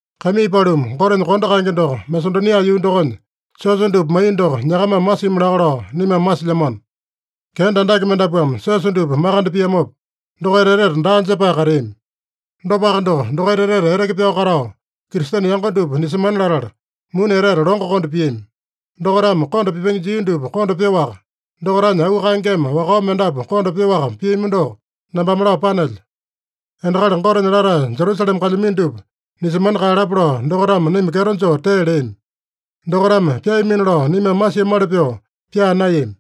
Kaimii paluma, Gotenya kondo kaenge doko Masedonia yuu dokonya siosa dupa maiya doko nyakamame masimi laka lao naimame masilyamano. Kenda andake mendapuame siosa dupa makande piamopa, dokaita etete daa jepae kateami. Dopaka doko, dokaita etete eteke pyao katao, Kristene yango dupa nisemana latala, muni etete longo konda piami. Dokaitame konda pipenge jia dupa konda pyoaka, dokaitanya auu kaengeme wakao mendapu konda pyoaka piami doko nambame lao panelyo. Endakali Gotenya latae Jerusalema kalyamino dupa nisemana kaeyalapa lao dokaitame naima kyeto joo tee leami. Dokaitame pyaamino lao naimame masiamali pyoo pyaa naeyami.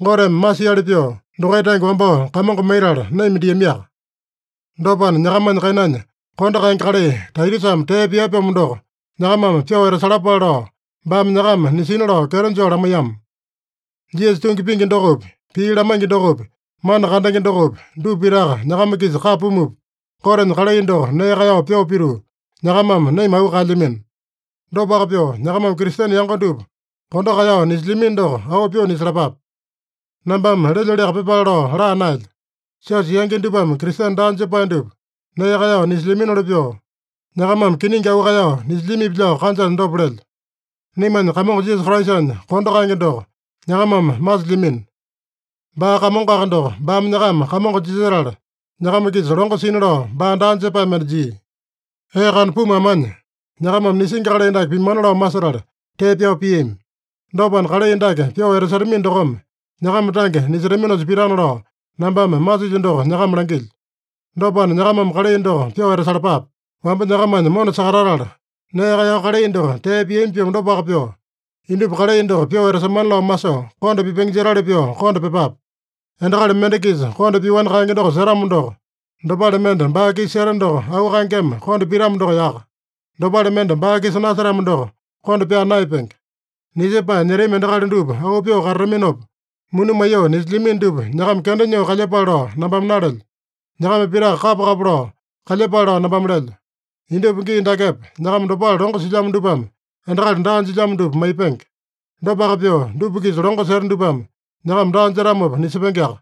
Goteme masiali pyoo, dokaita tange wambao Kamongo maitala, naima diamiaka. Dopana, nyakamanya kainanya kondo kaenge kalai Taitusame tee pia-pyomo doko, nyakamame pyoo etasalapale lao, baame nyakama nisina lao kyeto joo lamaiyama. Jisasa tungi pingi dokopi, pii lamaingi dokopi, mana kandenge dokopi, dupa pitaka nyakama-kisa kapa pumupa, Gotenya kalai doko nee kaeyao pyoo pituu, nyakamame naima auu kaelyamino. Dopaka pyoo, nyakamame Kristene yango dupa kondo kaeyao nisilyamino doko auu pyoo nisalapape. Nambame lelyoliaka pyepale lao laa naelyo. Siosa yangi dupame Kristene daa jepae dupa nee kaeyao nisilyaminoli pyoo, nyakamame kiningi auu kaeyao nisilyamipi lao kanjanya dopa lelyo. Naimanya Kamongo Jisasa Kraisanya kondo kaenge doko nyakamame masilyamino. Baa Kamongoaka doko, baame nyakama kamongo jisetala nyakama-kisa longo sina lao baa daa jepae mende jia. Ee kana pumu amanya, nyakamame nisingi kalai dake pimana lao masetala tee pyao piami. Dopana, kalai dake pyoo etasetamino dokome, nyakama tange nisetaminosa pitana lao nambame masilyo doko nyakama langilyo. Dopana, nyakamame kalai doko pyoo etasalapape. Wamba nyakamanya mona sakatatala, nee kaeyao kalai doko tee piami-pyomo dopaka pyoo, indupa kalai doko pyoo etasemana lao masoo, konda pipenge jetali pyoo konda pyepape. Endakali mende-kisa konda pyoani kaenge doko setamo doko, dopale mende baa-kisa seta doko auu kaengeme konda pitamo doko yaka. Dopale mende baa-kisa nasetamo doko konda pyaa naeyapenge. Nisepae nyetami endakali dupa auu pyoo katataminopa, muni maiyoo nisilyamino dupa nyakama kenda nyoo kalyepale lao nambame nalelyo. Nyakama pitaka kapa-kapa lao kalyepale lao nambame lelyo. Indupa gii dakepa, nyakama dopale longo silyamo dupame endakali daa jilyamo dupa maipenge. Dopaka pyoo, dupa-kisa longo seta dupame nyakama daa jetamopa nisepengeaka.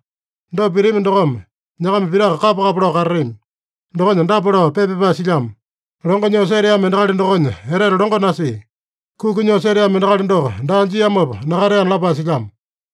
Dopa pitami dokome, nyakama pitaka kapa-kapa lao katatami. Dokonya dapa lao pii pepa pyapae silyamo: “Longo nyoo seteamo endakali dokonya etete longo nasia. Kuki nyoo seteamo endakali doko daa jiamopa nakateana” lapae silyamo.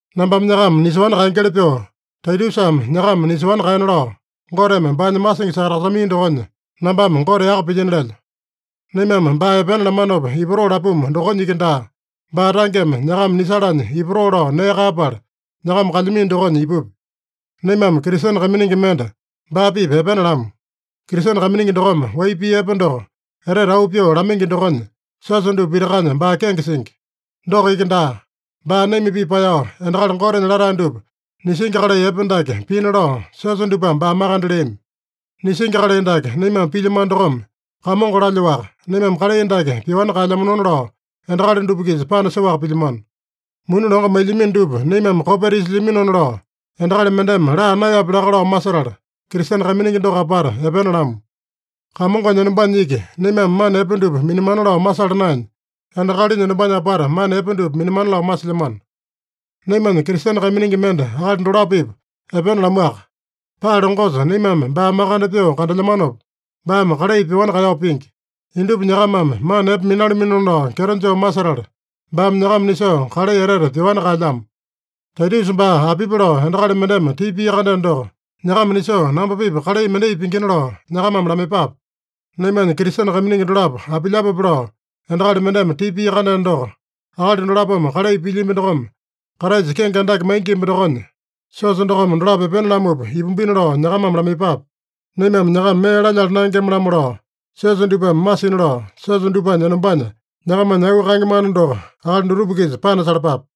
Nambame nyakama nisoani kaengeli pyoo, Taitusame nyakama nisoani kaena lao, Goteme baanya masingi sakatasakamaiya dokonya, nambame Gote yaka pilyino lelyo. Naimame baa epena lamanopa ipatoo lapumu dokonya iki daa, baa tangeme nyakama nisalanya ipatoo lao nee kaeyapala, nyakama kalyamino dokonya ipupya. Naimame Kristene kaiminingi mende baa-pipa epena lamu. Kristene kaiminingi dokome wai pii epe doko etete auu pyoo lamaingi dokonya, siosa dupa pitakanya baa kenge singi. Doko iki daa. Baa naima-pipa paeyao, endakali Gotenya latae dupa nisingi kalai epe dake pina lao siosa dupame baa makande leami. Nisingi kalai dake naimame pilyamano dokome, Kamongo lalyoaka, naimame kalai dake pyoani kaelyamanona lao endakali dupa-kisa panasoaka pilyamano. Muni longo mailyamino dupa naimame kopeta isilyaminona lao, endakali mendeme laa naeyapya laka lao masetala, Kristene kaiminingi doko apata epena lamu. Kamongonya enombanya iki naimame mana epe dupa minamana lao masala naenya, endakalinya enombanya apata mana epe dupa minamana lao masilyamano. Naimanya Kristene kaiminingi mende akali dolapo-pipa epena lamuaka. Paa longosa naimame baa makande pyoo kandelyamanopa, baame kalai pyoani kaeyao pingi. Indupa nyakamame mana epe minalaminona lao kyeto joo masetala, baame nyakama nisoo kalai etete pyoani kaelyamo. Taitusa baa apipi lao endakali mendeme tipa pia-kandeno doko, nyakama nisoo namba-pipa kalai mendai pingina lao nyakamame lamaiyepape. Naimanya Kristene kaiminingi dolapo apilyapope lao endakali mendeme tipa pia-kandeno doko, akali dolapome kalai pilyambi dokome Kraisa kenge andake maingimba dokonya, siosa dokome dolapo epena lamupa ipumbina lao nyakamame lamaiyepape. Naimame nyakama mee lalyala naengema-lamo lao siosa dupame masina lao, siosa dupanya enombanya nyakamanya auu kaenge mana doko akali dutupa-kisa panasalapape.